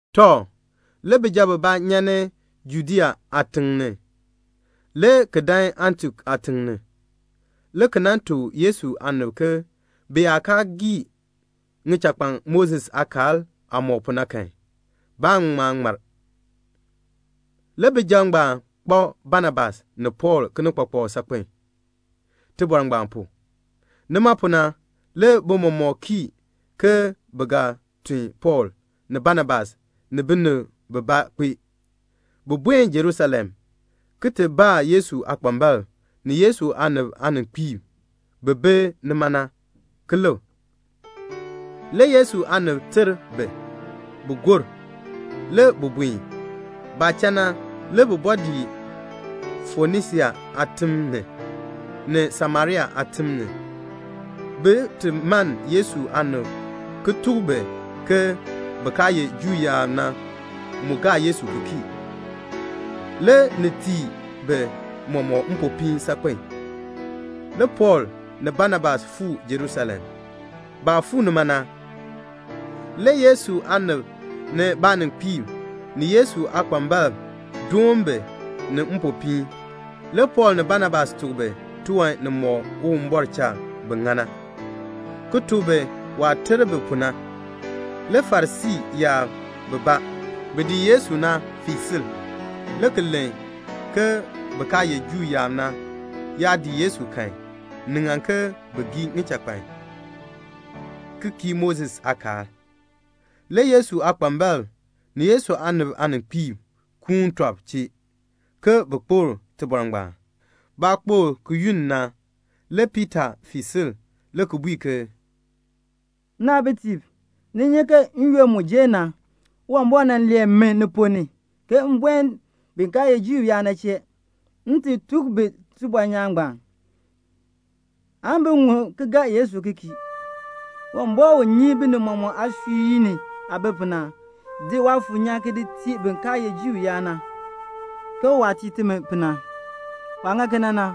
Tɔ, le bijab bibaa nyan ni Judea aatiŋ ni, le ki dan Antiok aatiŋ ni, le ki nan tuk Yesu aanib ke bi yaa kaa gii ŋichakpan Moses aakaal aah mɔk pu na kan, baan ŋma ŋmar. Le bijab ngbaan kpak Banabas ni Pɔɔl kinikpakpak saakpen tibɔr ngbaan pu. Nima pu na, le bi mɔmɔk kii ke bi ga tun Pɔɔl ni Banabas ni binib bibaa kpee, bin buen Jerusalem, ki ti baa Yesu aakpambalb ni Yesu aanib aaninkpiib bi bi nima na, ki lik. Le Yesu aanib ter bi, bin gor. Le bi buen. Baah cha na, le bi bɔɔ dii Fonisia aatim ni, ni Samaria aatim ni, bin ti mann Yesu aanib ki tuk bi ke bin kaa ye Juu yaab na mu gaa Yesu ki kii. Le ni tii bi mɔmɔk mpopiin saakpen a. Le Pɔɔl ni Banabas fuu Jerusalem. Baah fuu nima na, le Yesu aanib ni baaninkpiib ni Yesu aakpambalb doon bi ni mpopiin. Le Pɔɔl ni Banabas tuk bi tiwan nimɔk Uwumbɔr cha bi ŋa na, ki tuk bi waah ter bi pu na. Le Farisii yaab bibaa, bi dii Yesu na, fii sil, le ki len ke bin kaa ye Juu yaab na yaa dii Yesu kan, ni ŋan ke bin gii ŋichakpan, ki kii Moses aakaal. Le Yesu aakpambalb ni Yesu aanib aaninkpiib kuun tɔb chee, ke bin kpokl tibɔr ngbaan. Baah kpokl ki yunn na, le Piita fii sil le ki bui ke, "Nnaabitiib, ni nyi ke n-yoonn mu jer na Uwumbɔr nan lee mi ni ponn ni, ke m buen bin kaa ye Juu yaab na chee, m ti tuk bi tibɔnyaan ngbaan, aan bin ŋun ki gaa Yesu ki kii. Uwumbɔr u nyi binib mɔmɔk aasui ni aah bi pu na nan di Waafuur nyaan ki di tii bin kaa ye Juu yaab na, ke waah tii timi pu na. Waah ŋa kena na,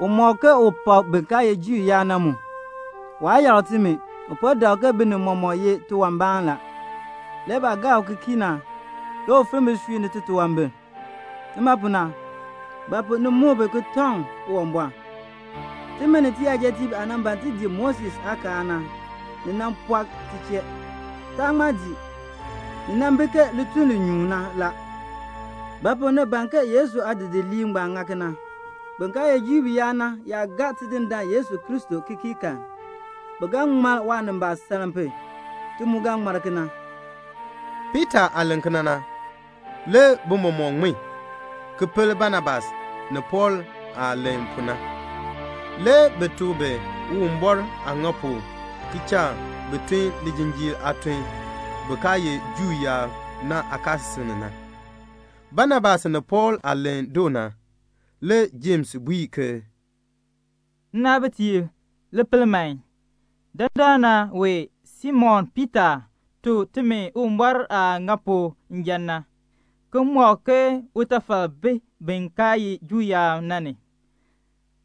u mɔk ke u pak bin kaa ye Juu yaab na mu. Waa yakr timi. U po dak ke binib mɔmɔk ye tiwanbaan la. Le baah gaa u ki kii na, le u finn bisui ni titunwambir. Nima pu na, ba pu ni muk bi ki tɔŋ Uwumbɔr? Timi ni tiyajatiib aah nan ban ti dii Moses aakaal na, ni pɔɔ ti chee. Taa ŋma dii. Ni bi ke lituln li nyuun na la. Ba pu ni ban ke Yesu aadidiliib ngbaan ŋa kena? Bin kaa ye Juu yaab na yaa gaa Tidindaan Yesu Kristo ki kii kan, bi ga ŋmar waanimbaasaln pu. Ti mu ga ŋmar kena." Piita aah len kena na, le bi mɔmɔk ŋmin, ki pel Banabas ni Pɔɔl aah len pu na. Le bi tuk bi Uwumbɔr aah ŋa pu ki cha bi tun lijinjiir aatun bin kaa ye Juu yaab na aakaasisik ni na. Banabas ni Pɔɔl aah len doo na, le Jems bui ke, "Nnaabitiib, li pel man. Dandana wee Simon Piita tuk timi Uwumbɔr aah ŋa pu njan na, ki mɔk ke utafal bi bin kaa ye Juu yaab na ni,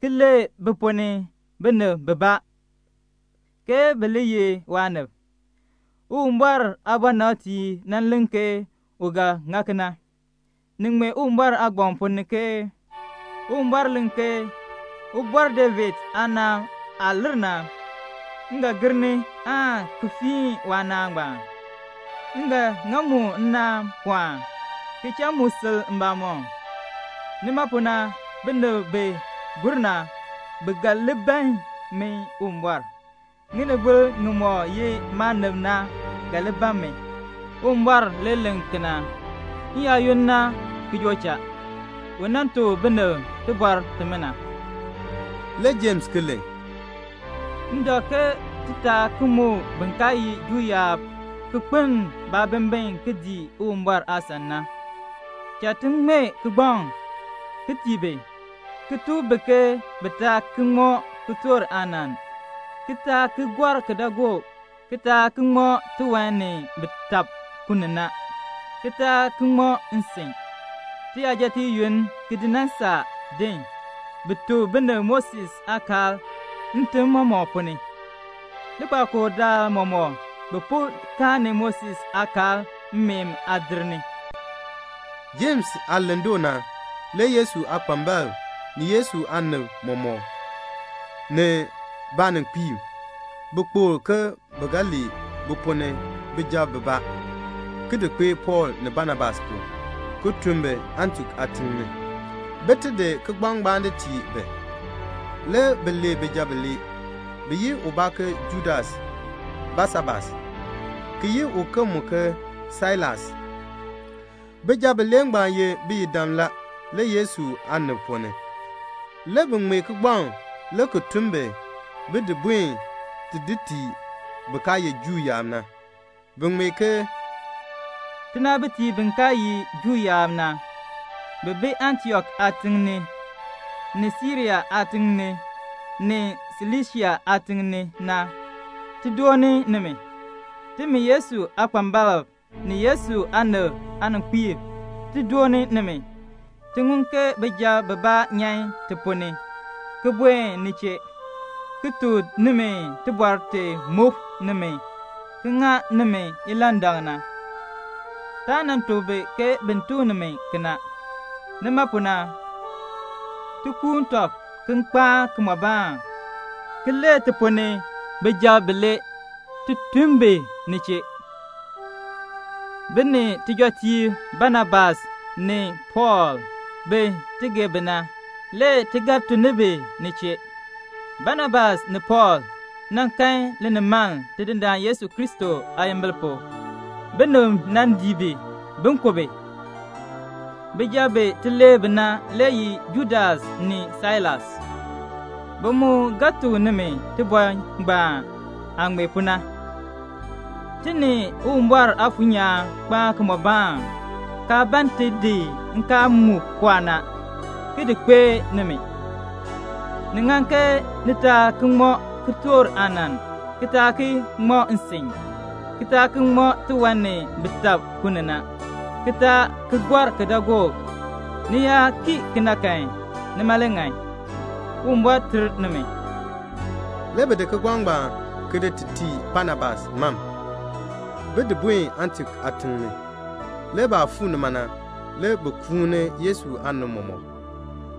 ki lee bi ponn ni binib bibaa, ke bi li ye waanib. Uwumbɔr aabɔnabtiib nan len ke u ga ŋa kena. Ni ŋmee Uwumbɔr aagbaŋ ponn ni ke 'Uwumbɔr len ke: Ubɔr David aanaan aah lir na, m ga gir ni aan ki fiin waanaan ngbaan. M ga ŋa mu nnaan pɔɔn, ki cha mu sil mbamɔm. Nima pu na binib bi gur na, bi ga li ban min Uwumbɔr. Ŋinibol ŋimɔk ye maanib na ga li ban min. Uwumbɔr le len kena. N-yaayoonn na ki joo cha, u nan tuk binib tibɔr timina."' Le Jems ki len, "M dak ke ti taa ki muk bin kaa ye Juu yaab ki kpeln baabimbin ki dii Uwumbɔr aasan na. Cha ti ŋmee kigbaŋ ki tii bi, ki tuk bi ke bi taa ki ŋmɔ kitork aanann, ki taa ki gɔr kidaagook, ki taa ki ŋmɔ tiwan ni bi tab ku ni na, ki taa ki ŋmɔ nsin. Tiyajatiib yoonn ki di nan saa din, bi tuk binib Moses aakaal ntim mɔmɔk ponn ni. Likpakool daal mɔmɔk bi po karni Moses aakaal mmeen aadir ni." Jems aah len doo na, le Yesu aakpambalb, ni Yesu aanib mɔmɔk, ni baaninkpiib, bi kpokl ke bi ga lee bi ponn ni bijab bibaa, ki di kpee Pɔɔl ni Banabas pu, ki tun bi Antiok aatiŋ ni, bin ti di kigbaŋ ngbaan di tii bi. Le bi lee bijab bilee. Bi yi ubaa ke Judas Basabas, ki yi uken ke Sailas. Bijab bilee ngbaan ye biyidam la le Yesu aanib ponn ni. Le bi ŋmee kigbaŋ le ki tun bi, bin di buen ti tii bin kaa ye Juu yaab na. Bi ŋmee ke "Tinaabitiib bin kaa ye Juu yaab na, bi bi Antiok aatiŋ ni, ni Siria aatiŋ ni, ni Silisia aatiŋ ni na, ti dooni nimi. Timi Yesu aakpambalb, ni Yesu aanib aaninkpiib, ti dooni nimi. Ti ŋun ke bijab bibaa nyan ti ponn ni, ki buen ni chee, ki tuk nimi tibɔr ti muk nimi ki ŋa nimi ilandak na. Taa nan tuk bi ke bin tuk nimi kena. Nima pu na, ti kuun tɔb ki kpaan kimɔbaan, ki lee ti ponn ni bijab bilee, ti tun bi ni chee. Bi ni tijɔtiib Banabas ni Pɔɔl, bin ti gee bi na, le ti ga tun ni bi ni chee. Banabas ni Pɔɔl nan kan linimaln Tidindaan Yesu Kristo aayimbil pu. Binib nan dii bi, bin ku bi. Bijab bi ti lee bi na le ye Judas ni Sailas. Bi mu ga tuk nimi tibɔr ngbaan aah ŋmee pu na. Ti ni Uwumbɔr Aafuur nyaan kpaan kimɔbaan, kaa ban ti di nkaal mu pɔɔ na, ki di kpee nimi. Ni ŋan ke ni taa ki ŋmɔ kitork aanann, ki taa ki ŋmɔ nsin, ki taa ki ŋmɔ tiwan ni bi tab ku ni na, ki taa ki gɔr kidaagook. Ni yaa kii kena kan, nima le ŋan. Uwumbɔr ter nimi." Le bi di kigbaŋ ngbaan ki di tii Banabas mam, bin di buen Antiok aatiŋ ni. Le baah fuu nima na, le bi kuuni Yesu aanib mɔmɔk,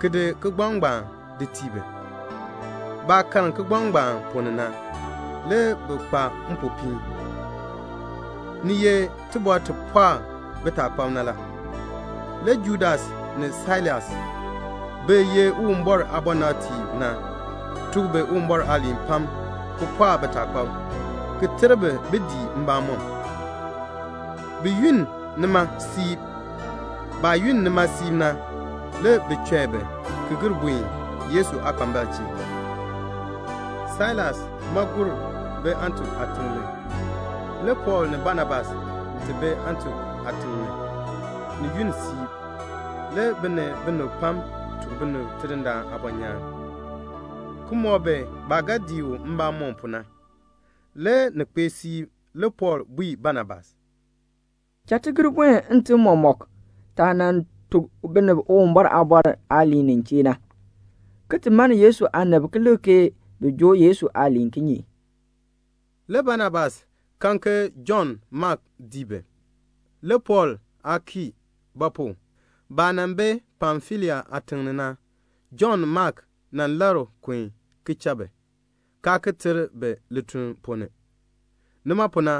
ki di kigbaŋ ngbaan di tii bi. Baah karn kigbaŋ ngbaan ponn ni na, le bi kpa mpopiin. Ni ye tibɔr ti pɔɔk bitaakpab na la. Le Judas ni Sailas bi ye Uwumbɔr aabɔnabtiib na, tuk bi Uwumbɔr aaliin pam ki pɔɔk bitaakpab, ki ter bi bin dii mbamɔm. Bi yunn nima siib. Baah yunn nima siib na, le bi chɔi bi ki gir buen Yesu aakpambalb chee. [ Sailas ma gur bi Antiok aatiŋ ni.] Le Pɔɔl ni Banabas ti bi Antiok aatiŋ ni, ni yunn siib. Le bi ni binib pam tuk binib Tidindaan aabɔnyaan, ki mɔk bi baah ga dii u mbamɔm pu na. Le ni kpee siib le Pɔɔl bui Banabas, "Cha ti gir buen ntim mɔmɔk, taah nan tuk binib Uwumbɔr aaliin nin chee na, ki ti mann Yesu aanib ki lik ke bi joo Yesu aaliin kinye?" Le Banabas ban ke Jɔnn Mak dii bi. Le Pɔɔl aa kii; ba pu? baah nan bi Pamfilia aatiŋ ni na, Jɔnn Mak nan labr kun ki cha bi, kaa ki ter bi lituln ponn ni. Nima pu na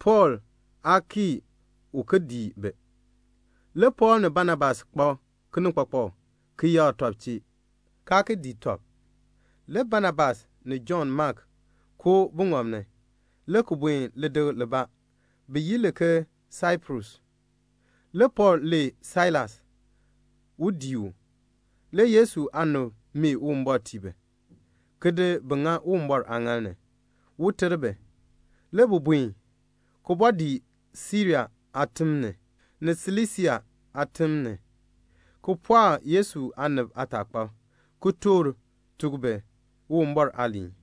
Pɔɔl aa kii un ki dii bi. Le Pɔɔl ni Banabas kpak kinikpakpak ki yakr tɔb chee, kaa ki dii tɔb. Le Banabas ni Jɔnn Mak koo buŋɔb ni, le ki buen lidikl libaa bi yi li ke Saiprus. Le Pɔɔl lee Sailas un dii u. Le Yesu aanib mee Uwumbɔr tii bi, ki di bi ŋa Uwumbɔr aaŋaal ni, un ter bi. Le bi buen, ki bɔɔ dii Siria aatim ni, ni Silisia aatim ni, ki pɔɔk Yesu aanib aataakpab, ki toor tuk bi Uwumbɔr aaliin.